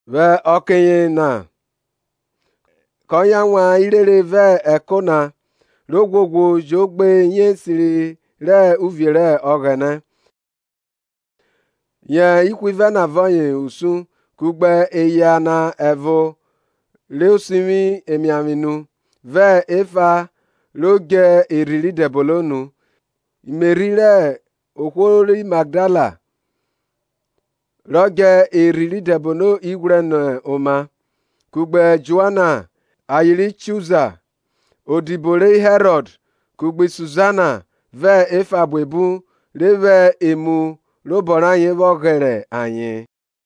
Vwẹ ọke yena kọ yan wan irere vẹ ẹko na, ro ghwoghwo jo gbe iyẹnrẹ esiri rẹ uvie rẹ Ọghẹnẹ. Ye ihwivẹ na vẹ ọye usun, kugbe eya na ẹvo ro sivwi emiavwe nu vẹ efa rọ djẹ erhi rẹ idẹbono nu; Meri rẹ ohwo ri Magdala, rọ djẹ erhi rẹ idẹbono ighwrẹ nẹ oma, kugbe Joana, aye ri Chuza, odibo ri Herọd, kugbe Suzana, vẹ efa buebu re vwẹ emu rẹ obọ rayen vwọ ghẹrẹ ayen.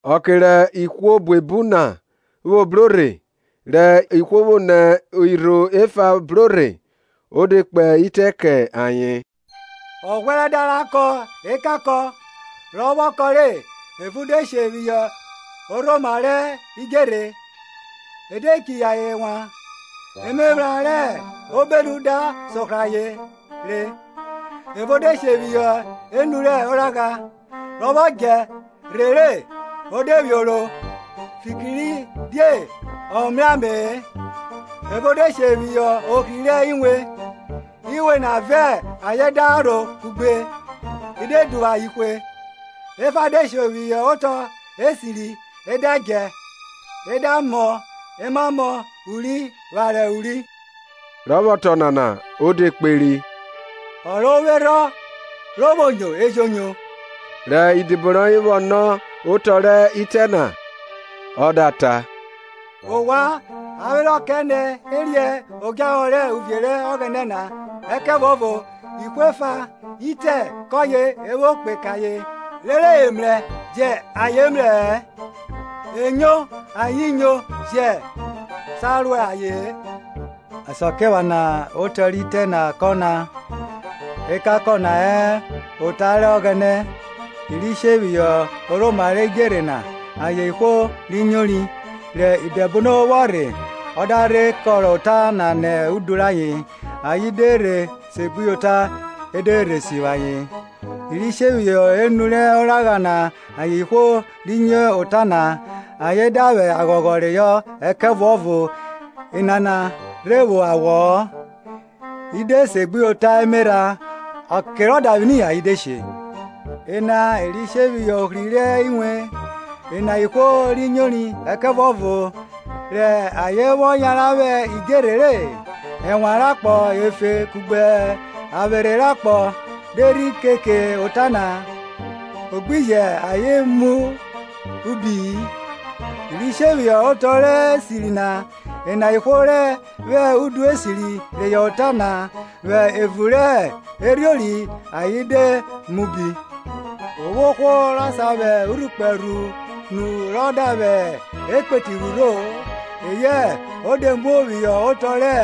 Ọke rẹ ihwo buebu na vwo bro rhe, rẹ ihwo vwo nẹ irho efa bro rhe, o de kpe itẹ kẹ ayen; Ọghwẹrẹ da ra kọn ekankọn; rọ vwọ kọn re, evo de she phihọ orhoma rẹ idjerhe, e de chiyin ayen wan, emephran rẹ obenu da sohrọ re. Evo de she phiyọ enu rẹ oragha; rẹ e vwọ djẹ rhe re, i de vwioro, fikiridie e mrẹ ame-e. Ẹvo de she phiyọ ohri rẹ iwen; iwen na vẹ ayen da rho kugbe i de duvwu aye hwe. Efa de she phiyọ otọ esiri, e da djẹ, e da mọ emamọ uri akon uri. Rẹ ọ vwọ ta Ọnana, o de kperi, ''Ọ ro vwo erhọn ro vwo nyo, e jẹ o nyo. Rẹ idibo rọyen vwọ nọ otọ rẹ itẹ na, ọ da ta, ''Ovwan a vwe rọ kẹ ne riẹn odjahọ rẹ uvie rẹ Ọghẹnẹ na; ẹkẹvuọvo ihwo efa itẹ kọyen e vwo kpe ke ayen, rere dede nẹ ayen mrẹ-ẹ, enyo ayen nyo jọ sa ro aye-en. Asakiephana otọ rẹ itẹ na kẹ ọna, Ekankọn na ọyẹn ota rẹ Ọghẹnẹ. I ri she phiyọ orhoma rẹ idjerhe na ayen Ihwo ri nyori; ọke rẹ idẹbono vwọ rhe ọ da rhe kọrọ ota na nẹ udu rayen, rere ayen de rhe segbuyota e de rhe sivwi ayen. I ri she phiyọ enu rẹ oragha na ayen ihwo ri nyo ota na, ayen da vwẹ aghọghọ reyọ; ẹkẹvuọvo enana rhe vwo awọ-ọ, i de segbuyota emerha ọke rẹ odavwini ayen de she. Ena iri she phiyọ ohri rẹ iwen, ena ihwo ri nyori, ẹkẹvuọvo rẹ ayen vwọ yanran vwẹ idjerhe re, ẹnwan rẹ akpọ efe kugbe avwerhe rẹ akpọ de rhi keke ota na, o gbi jẹ ayen mọ ubi-i. I ri she phiyọ otọ esiri na, ena ihwo re vwẹ udu esiri reyọ ota na, vwẹ evun rẹ erhiori ayen da mọ ubi. O vwo ohwo rọ sa vwẹ urhukpẹ rhu nu rọ da vwẹ ekpeti rhurho-o, eyẹn o de muo phiyọ otọ rẹ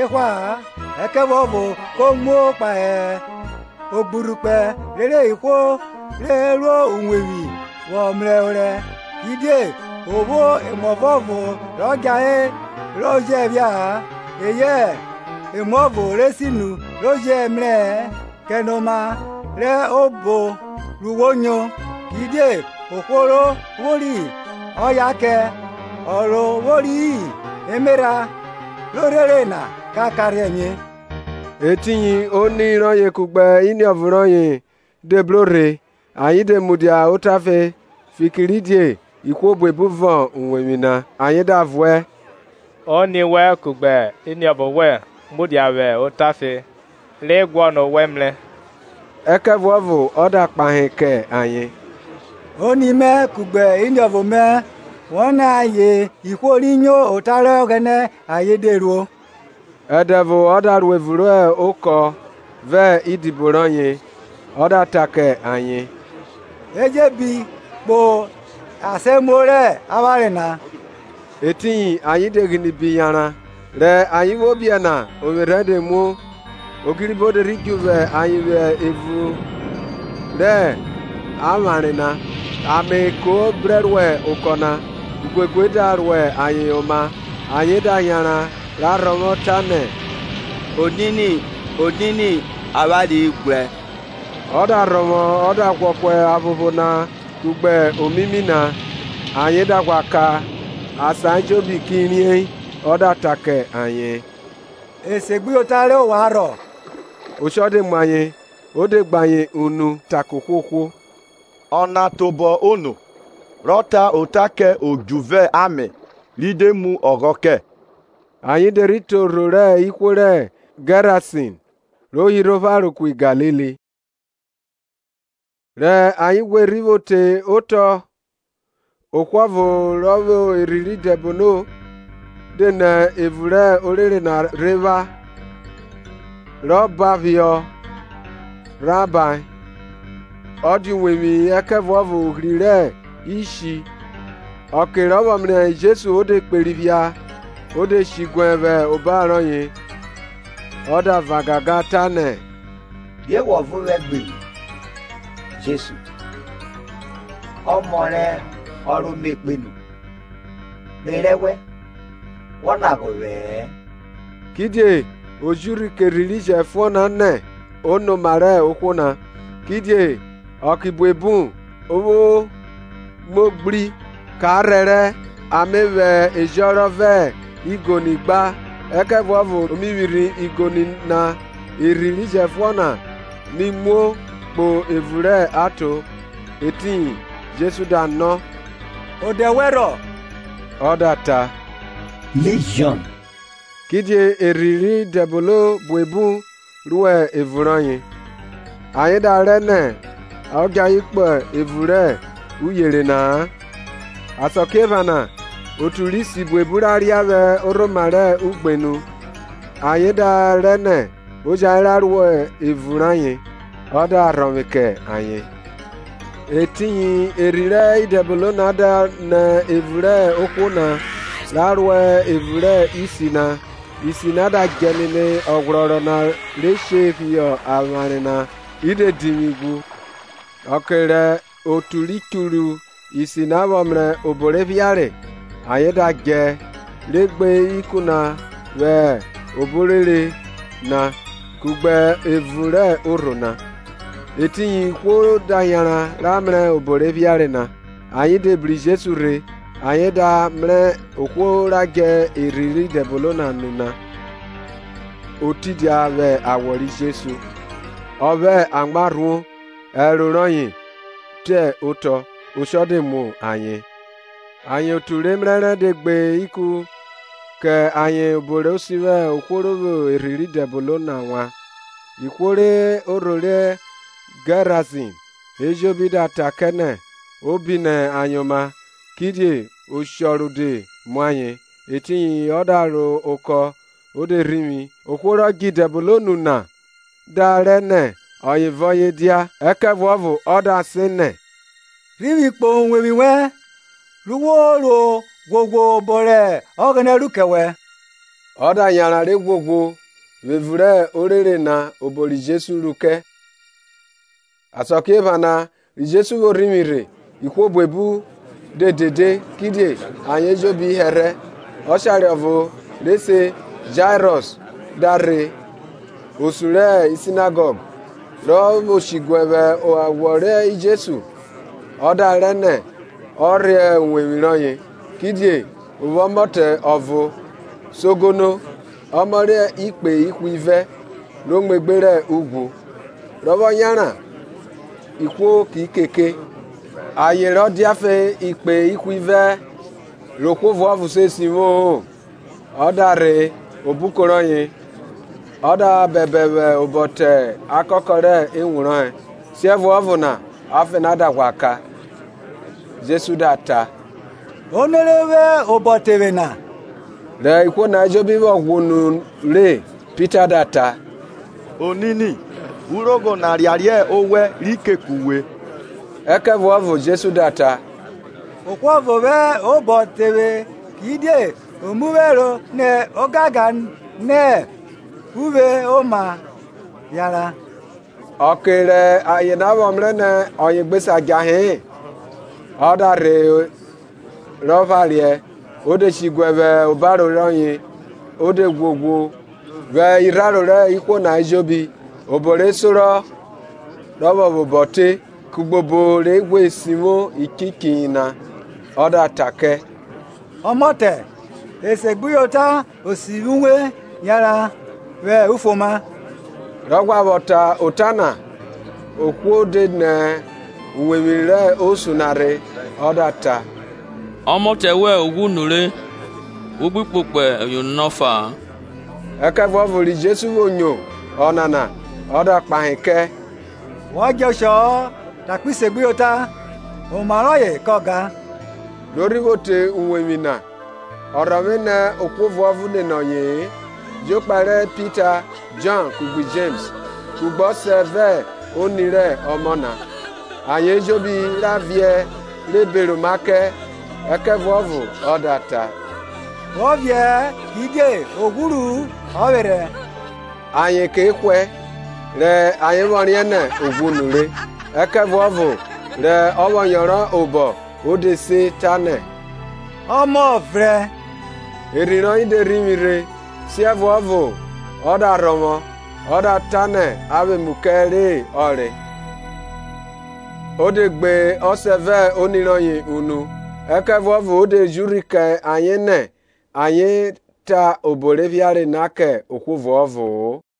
ehwa-a, ẹkẹvuọvo ko muo kpahe ogburhukpẹ rere ihwo re ro uwevwi vwọ mrẹ orẹ. Kidie o vwo emuọvuọvo rọ djahere ro jẹ phia-a, eyẹn emuọvuọvo re sinu re jẹ mrẹ-ẹ. Kẹnoma rẹ obo ru wo nyo; kidie ohwo ro vwori ọyen a kẹ, ọ rọ vwori-i, emerha ro rhere na ka karhiẹ mie. Etiyin oni rọyen kugbe iniọvo rọyen de bro rhe ayen de mudia otafe fikiridie ihwo buebu vọn uwevwi na. Ayen da vuẹ, ''Oni wẹn kugbe iniọvo wẹn mudia vwẹ otafe, re guọnọ owẹ mrẹ. Ẹkẹvuọvo ọ da kpahe kẹ ayen, Oni mẹ kugbe iniọvo mẹ vwonẹ ayen ihwo ri nyo ota rẹ Ọghẹnẹ ayen de ruo. Ẹdẹ ọvo ọ da ro evun rẹ okọ ọ vẹ idibo rọyen, ọ da ta kẹ ayen, E je bi kpo esamuo rẹ avware na. Ẹtiyin ayen de ghine bi yanran, Rẹ ayen vwo biẹ na ovwerhẹ de muo. Ogiriho de ri dju vwa ayen vwẹ evun rẹ avwanre na, ame ko brẹ ro okọ na, uguegue da ro ayen oma. Ayen da yanran ra rhọvwọ, tanẹ, Onini, Onini, avwanre ghwrẹ Ọ da rhọvwọ ọ da ghwọ ku aphopho na kugbe omimi na; ayen da ghwa ka, asan ejobi ki riẹn. Ọ da ta kẹ ayen, Esegbuyota rẹ ovwan rhọ? Oshọ de mu ayen, o de gbe ayen unu, ta kẹ ohwohwo, Ọna tobọ ono, rọ ta ota kẹ odju vẹ ame, ri de mu ọghọ kẹ? Ayen de rhi te orho rẹ ihwo ri Gẹrasin, ro hirhe opharo ku Galili. Rẹ ayen ghwe rhi vwo te otọ, ohwo ọvo ro vwo idẹbono de nẹ evun rẹ orere na rhe vwa; rọ ban phihọ rhaha, ọ dia uwevwi-i ẹkẹvuọvo ohri re ishi. Ọke rọ vwọ mrẹ Jesu, o de kperi phia o de she diguẹ vwẹ obaro rọye, ọ da van gangan tanẹ, Die wọ vẹ ovwẹ gbi ru, Jesu, Ọmọ rẹ ọ ro Me kpenu? Me rẹ wẹ, Wọ lagba ovwẹ-ẹ. Kidie o ji urhi kẹ erhi ro jẹfuọn na nẹ o nẹ oma rẹ ohwo na. (Kidie ọke buebu o vwo muo ghri; ka rhẹrẹ, a Me vwẹ ejọnrọn vẹ igoni gba, ẹkẹvuọvo o mi vwirhi igoni na erhi ro jẹfuọn na mi muo kpo evun rẹ aton.) Etiyin Jesu da nọ, Odẹ wẹn rhọ? Ọ da ta, Lijiọn; kidie erhi rẹ idẹbono buebu ro evun rọye. Ayen da rẹ nẹ ọ djẹ ayen kpo evun rẹ Uyere na-a. Asakiephana otu rẹ isi buebu ra ria vwẹ orhoma rẹ ugbenu; ayen da rẹ nẹ o jẹn ayen ro evun rayen. Ọ da rhọvwe kẹ ayen. Etiyin erhi rẹ idẹbono na de nẹ evun rẹ ohwo na ra ro evun rẹ isi na, isi na da djẹ nene ọghwrọrọ na re she phiyọ avware na i de divwi ghwu. Ọke rẹ otu ri churu isi na vwọ mrẹ obo re phiare, ayen da djẹ, re gbe ikun na vwẹ obo orere na kugbe evun rẹ orho na. Etiyin ihwo da yanran ra mrẹ obo re phiare na, ayen de bru Jesu rhe, ayen da mrẹ ohwo na ra djẹ erhi rẹ idẹbono nu na, o tidia vwẹ awọ ri Jesu, ọ vwẹ amwa rhuo ẹro rọye te otọ; oshọ de mu ayen. Ayen otu re mrẹrẹ de gbe kẹ ayen obo re sivwi ohwo ro vwo erhi rẹ idẹbono na wan. Ihwo rẹ orho ri Gẹrasin ejobi da ta kẹ nẹ o bi nẹ ayen oma; kidie oshọ rode mu ayen; Etiyin ọ da ro okọ o de rhivwi. Ohwo rọ djẹ Idẹbono nu na da rẹ nẹ ọye vẹ Jesu dia; ẹkẹvuọvo ọ da sen nẹ, Rhivwi kpo uwevwi wẹn, ru wo re ghwoghwo obo rẹ Ọghẹnẹ ru kẹ wẹ. Ọ da yauran re ghwughwu vwẹ evun rẹ orere na obo ri Jesu ru kẹ. Asakiephana ri Jesu vwo rhivwi rhe, ihwo buebu de dede, kidie ayen ejobi hẹrhẹ. Ọshare ọvo re se Jairọs da rhe, osun ri Sinagọg; ro vwo shiguẹ vwẹ awọ ri Jesu ọ da rẹ nẹ ọ rhe uwevwi rọye, kidie o vwo ọmọtẹ ọvo sogono, ọmọ rẹ ikpe ihwivẹ, ro muegbe rẹ ughwu. Rọ vwọ yanran, ihwo ki keke. Ayen rọ dia afe ikpe ihwivẹ re ohwo ọvuọvo se sivwo-o,. ọ da rhe obuko rọye, ọ da hẹhẹ vwẹ obo te akakọ rẹ ewun rọye; siẹvuọvo na afe na da ghwa ka. Jesu da ta, Ono re vwẹ obọ te vwe na? Rẹ ihwo ejobi vwọ ghwọunu re, Pita da ta, Onini, urogho na riariẹ owẹ ri keke uwe! Ẹkẹvuọvo Jesu da ta, Ohwo ọvo vwẹ obo te vwẹ kidie o mu vwe ẹro nẹ ogangan nẹ uvwe oma yanran. Ọke rẹ aye na vwọ mrẹ nẹ ọye gbe sa djahe-e, ọ da rhe rọ phariẹ, o de shiguẹ vwẹ obaro rọye o de ghwoghwo vwẹ irharo rẹ ihwo na ejobi obo re sorọ rọ vwẹ obọ te, kugbe obo re ghwe sivwo ichiehiyi na. Ọ da ta kẹ, Ọmọtẹ, esegbuyota o sivwi uwe; yanran vwẹ ufuoma. Rọ ghwa vwọ ta ota na, ohwo de nẹ uwevwi rẹ osun na rhe ọ da ta, Ọmọtẹ wẹn o ghwu nure; wo gbi kpokpo oyono na ọfa-a. Ẹkẹvuọvo ri Jesu vwo nyo ọnana o da kpahe kẹ, Wọ djẹ oshọ-ọ; takpi segbuyota, oma rọye kọ gan. Ro rhi vwo te uwevwi na, ọ rhọvwe nẹ ohwo ọvuọvo nene ọye-e, jokpa ri Pita, Jọn kugbe Jems, kugbe ọsẹ vẹ oni rẹ ọmọ na. Ayen ejobi ra viẹ re beroma kẹ; ẹkẹvuọvo ọ da ta, Wọ viẹ-ẹ; kidie o ghwuru-u ọ vwerhẹ. Ayen ke hwẹ, rẹ ayen vwọ riẹn nẹ o ghwu nure. Ẹkẹvuọvo rọ vwọ yọnrọn obọ o de se tanẹ, Ọmọ, vrẹn. Erhi rọye de rhivwi rhe, siẹvuọvo ọ da rhọvwọ; ọ da ta nẹ a vwẹ emu kẹ re ọ re. O de gbe ọsẹ vẹ oni rọye unu; ẹkẹvuọvo o de ji urhi kẹ ayen nẹ ayen ta obo re phiare na kẹ ohwo ọvuọvo-o.